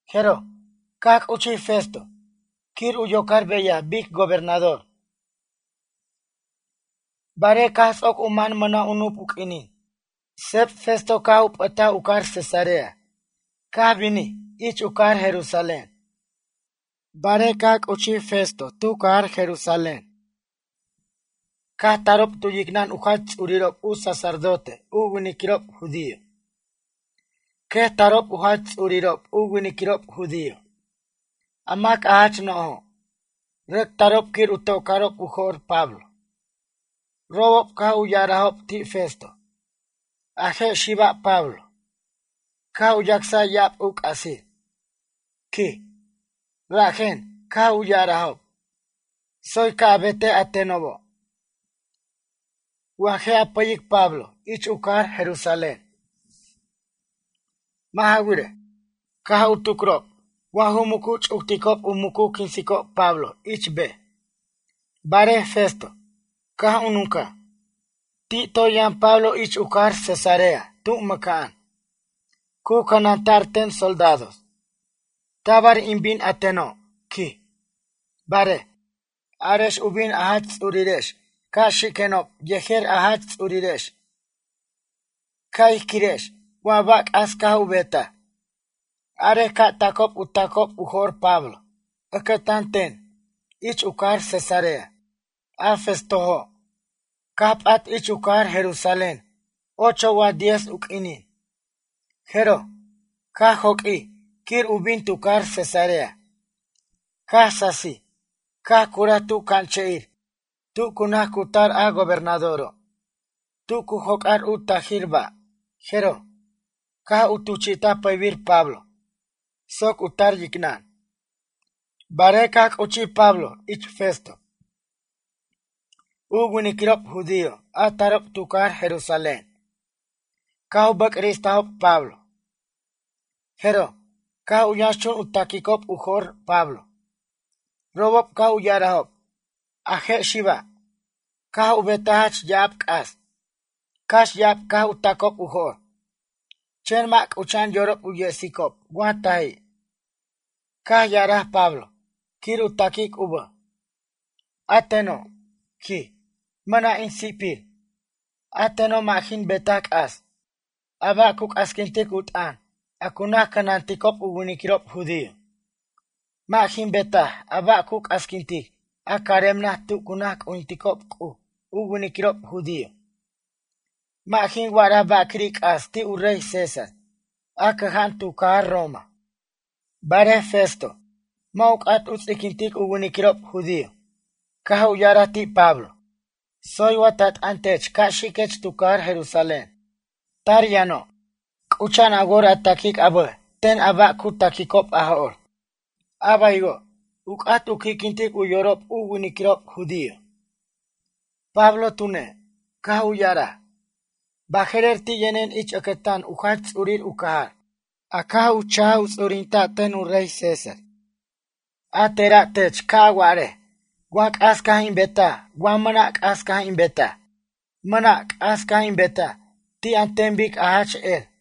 Jeroj, caj c'uchij Festo quir u yocar beyaj bic gobernador. Barej caj ts'oc u man mʌna' u nup u q'uinin, seb Festo caj u p'ʌtaj u cajar Cesarea caj binij ich u cajar Jerusalén. Barej caj c'uchij Festo tu cajar Jerusalén caj tarob tu yicnʌn u jach ts'urirob u sacerdote u winiquirob judío, quet tarob u jach ts'urirob u winiquirob judío, a mac a jach nojo'. Rʌc tarob quir u tocarob u jo'r Pablo. Robob caj u ya'arajob ti' Festo: ―A je' xiba' Pablo, caj u yacsaj ya'ab u c'asir ―quij. Rajen caj u ya'arajob: ―Tsoy ca' a betej a tenobo', wa je' a pʌyic Pablo ich u cajar Jerusalén. Mʌ' ja wirej, caj u tucrob wa ju mucu ch'ucticob u mucu quinsob Pablo ich bej. Barej Festo, caj u nuncaj: ―Ti' toy yʌn Pablo ich u cajar Cesarea tu mʌca'an, cu cʌnanta'r ten soldados. Tabar in bin a teno' ―quij―. Barej, arex u bin a jach ts'urirex ca' xiquenob yejer a jach ts'urirex ca' ij quirex wa ba' c'as caj u betaj. Arej ca' tacob u tacob u jo'r Pablo ʌcʌtan ten ich u cajar Cesarea. A Festojo', caj p'at ich u cajar Jerusalén ocho wa diez u q'uinin, jeroj, caj joq'uij quir u bin tu cajar Cesarea. Caj sasij caj curaj tu c'anche'ir tu cu naj cutar a gobernadoro', tu cu joc'ar u tajir ba', jeroj, caj u tuchi'taj pʌybir Pablo soc u tar yicnʌn. Barej caj c'uchij Pablo ich Festo, u winiquirob judío a tarob tu cajar Jerusalén, caj u bʌc'ristajob Pablo. Jeroj, caj u yʌnxchun u taquicob u jo'r Pablo. Robob caj u ya'arajob: ―A je' xiba', caj u betaj jach ya'ab c'as. Cax ya'ab caj u tacob u jo'r, chen mʌ' c'ucha'an yorob u yesicob wa taji'. Caj ya'araj Pablo quir u taquic u bʌj: ―A teno', ―quij―, mʌna' in si'pir. A teno' mʌ' jin betaj c'as, a ba' cu c'asquintic u t'ʌn a cu naj cʌnanticob u winiquirob judío. Mʌ' jin betaj a ba' cu c'asquintic a carem naj tu cu naj c'ujinticob C'uj u winiquirob judío. Mʌ' jin wa'ara ba'quiri' c'as ti' u rey César a cʌja'an tu cajar Roma. Barej Festo, mʌ' u c'at u ts'iquintic u winiquirob judío, caj u ya'araj ti' Pablo: ―Tsoy wa ta t'ʌn tech ca' xiquech tu cajar Jerusalén? Tar yʌno' c'ucha'an a wor a taquic a bʌj ten a ba' cu taquicob a jo'r. A baywo', u c'at u qui'quintic u yorob u winiquirob judío. Pablo tune', caj u ya'araj: ―Baje'rer ti' yʌnen ich ʌcʌtan u jach ts'urir u cajar, a caj u cha'j u ts'urinta' ten u rey César. A tera' tech ca' a wa'arej wa c'as caj in betaj wa mʌna' c'as caj in betaj. Mʌna' c'as caj in betaj ti' an ten bic a jach er.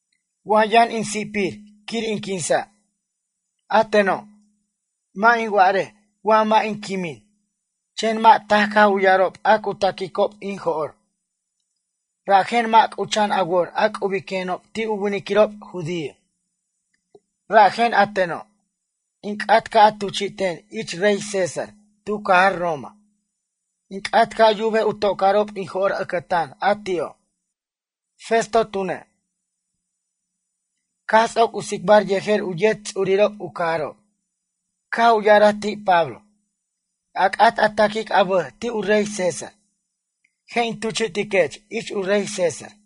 Wa yʌn in si'pir quir in quinsa'. A teno', mʌ' in warej wa mʌ' in quimin. Chen mʌ' taj caj u ya'arob a cu taquicob in jo'r, rajen mʌ' c'ucha'an a wor a c'ubiquenob ti' u winiquirob judío. Rajen a teno', in c'at ca' a tuchi'ten ich rey César tu cajar Roma. In c'at ca' yubej u tocarob in jo'r ʌcʌtan a ti'o'. Festo tune', caj ts'oc u tsicbar yejer u yet ts'urirob u cajarob, caj u ya'araj ti' Pablo: ―A c'at a taquic a bʌj ti' u rey César, je' in tuchi'tiquech ich u rey César.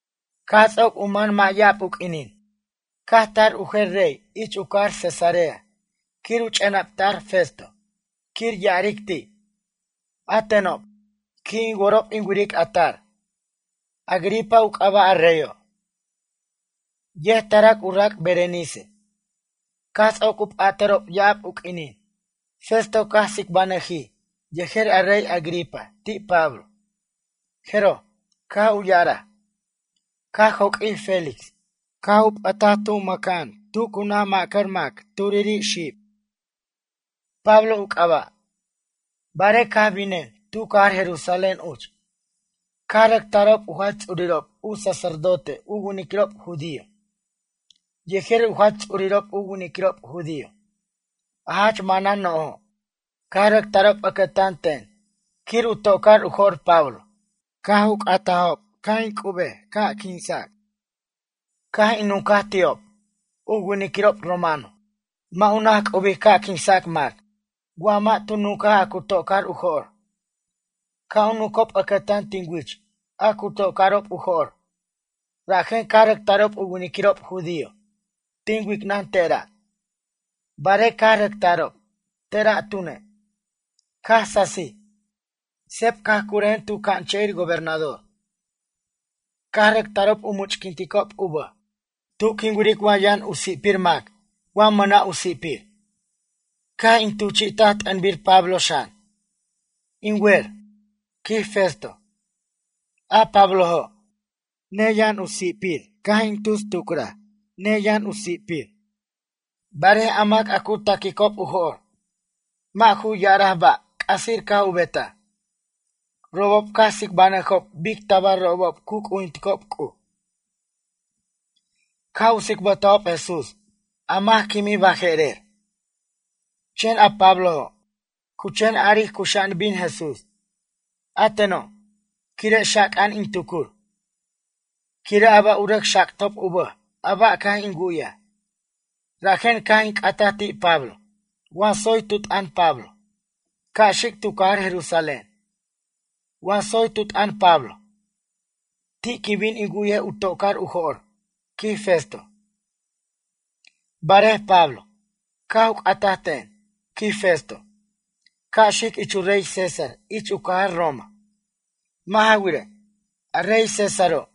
Caj ts'oc u man mʌ' ya'ab u q'uinin, caj tar u jer rey ich u cajar Cesarea quir u ch'enapta'r Festo quir ya'aric ti': ―A tenob, qui' in worob in wiricob a tar. Agripa u c'aba' a reyo'. Yet tarac u rac' Berenice. Caj ts'oc u p'atʌrob ya'ab u q'uinin, Festo caj tsicbanʌjij yejer a rey Agripa ti' Pablo. Jeroj, caj u ya'araj: ―Caj joq'uij Félix, caj u p'ʌtaj mʌca'an tu cu naj ma'cʌr mac turiri' xib. Pablo u c'aba'. Barej caj binen tu cajar Jerusalén uch, caj rʌc tarob u jach ts'urirob u sacerdote u winiquirob judío yejer u jach ts'urirob u winiquirob judío, a jach manan no'jo'. Caj rʌc tarob ʌcʌtan ten quir u tocor u jo'r Pablo. Caj u c'atajob ca' in c'ubej ca' quinsac. Caj in nuncaj ti'ob, u winiquirob romano mʌ' u naj c'ubic ca' quinsac mac wa mʌ' tu nuncaj a cu tocor u jo'r. Ca' u nuncob ʌcʌtan tin wich a cu tocarob u jo'r. Rajen caj rʌc tarob u winiquirob judío, tin wicnʌn tera'. Barej caj rʌc tarob, tera' tune', caj sasij, seb caj curʌjen tu c'anche'ir gobernador. Caj rʌc tarob u much'quinticob u bʌj tu quin wiric wa yʌn u si'pir mac wa mʌna' u si'pir. Caj in tuchi'taj t'ʌnbir Pablo xan. In wer ―quij Festo―, a Pablojo', neyʌn u si'pir caj in tus tucrej, neyʌn u si'pir. Barej a mac a cu taquicob u jo'r, mʌ' ju ya'araj ba' c'asir caj u betaj. Robob caj tsicbanʌjob bic tabar robob cu c'ujinticob C'uj. Caj u tsicbʌtajob Jesús a mac quimij baje'rer. Chen a Pablojo', cu chen aric cuxa'an bin Jesús. A teno', quire' xaca'an in tucur, quire' a ba' u rʌc xactob u bʌj a ba' caj in wu'yaj. Rajen caj in c'ataj ti' Pablo wa tsoy tu t'ʌn Pablo, ca' xic tu cajar Jerusalén, wa tsoy tu t'ʌn Pablo, ti' quin bin in wu'y u tocor u jo'r ―quij Festo―. Barej Pablo, caj u c'ataj ten ―quij Festo―, ca' xic ich u rey César ich u cajar Roma. Mʌ' ja wirej, a rey Césaro',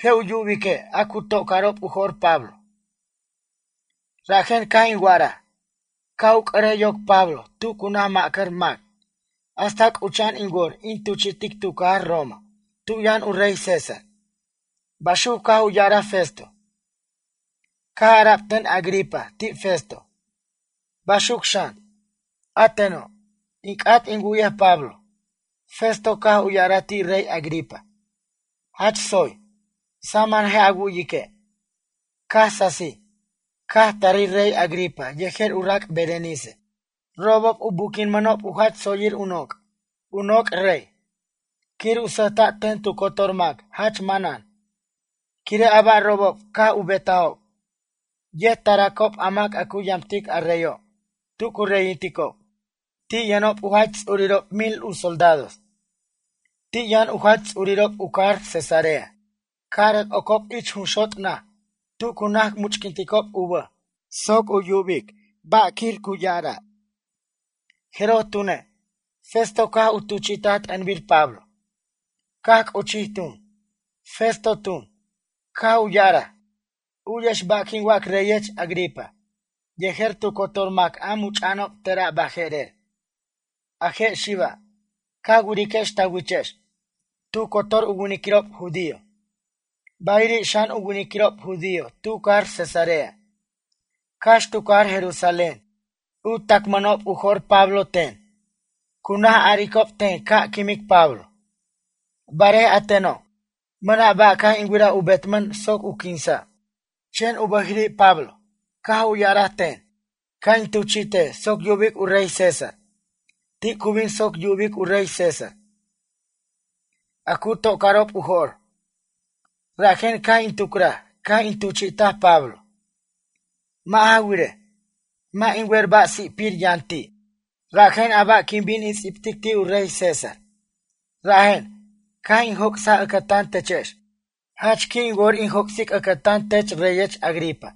je' u yubique' a cu tocarob u jo'r Pablo. Rajen caj in wa'araj, ca' u c'ʌrej yoc Pablo tu cu naj ma'cʌr mac hasta c'ucha'an in wor in tuchi'tic tu cajar Roma tu yʌn u rey César ―baxuc caj u ya'araj Festo. Caj ara'b ten Agripa ti' Festo: ―Baxuc xan, a teno', in c'at in wu'yej Pablo. Festo caj ya'araj ti' rey Agripa: ―Jach tsoy, saman je' a wu'yique'. Caj sasij, caj tarij rey Agripa yejer u rac' Berenice. Robob u buquinmʌnob u jach tsoyir u noc', u noc' rey, quir u sʌjta' ten tu cotor mac jach manan, quire' a ba' robob caj u betajob. Yet taracob a mac a cu yamtic a reyo' tu cu reyinticob. Ti' yʌnob u jach ts'urirob mil u soldados. Ti' yʌn xan u jach ts'urirob u cajar Cesarea. Ca rʌc ocob ich junxot' naj tu cu naj much'quinticob u bʌj soc yubic ba' quiri' ya'ara'. Jeroj tune', Festo caj u tuchi'taj t'ʌnbir Pablo. Caj c'uchij tun. Festo tun, caj u ya'araj: ―U'yex ba' quin wac reyech Agripa, yejer tu cotor mac a much'a'anob tera' baje'rer. A je' xiba', ca wiriquex ta wichex, tu cotor u winiquirob judío, bayiri' xan u winiquirob judío tu cajar Cesarea, cax tu cajar Jerusalén u tacmʌnob u jo'r Pablo ten. Cu naj aricob ten ca' quimic Pablo. Barej a teno', mʌna' ba' caj in wiraj u betmʌn soc u quinsa', chen u bʌjiri' Pablo caj ya'araj ten, ca' in tuchi'tej soc yubic u rey César. Ti' cu bin soc yubic u rey César a cu tocarob u jo'r, rajen caj in tucuraj caj in tuchi'taj Pablo. Mʌ' ja wirej, mʌ' in wer ba' si'pir yʌn ti', rajen a ba' quin bin in ts'ibtic ti' u rey César? Rajen, caj in joc'saj ʌcʌtan techex. Jach qui' in wor in joc'sic ʌcʌtan tech reyech Agripa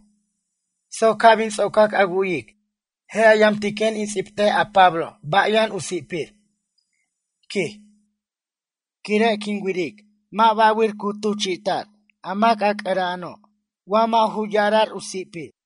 soc ca' bin ts'ocac a wu'yic je' a yamtiquen in ts'ibtej a Pablo ba' yʌn u si'pir ―quij―. Quire' quin wiric mʌ' ba'wir cu tuchi'ta'r mac a c'ʌra'ano' wa mʌ' ju ya'ara'r u si'pir.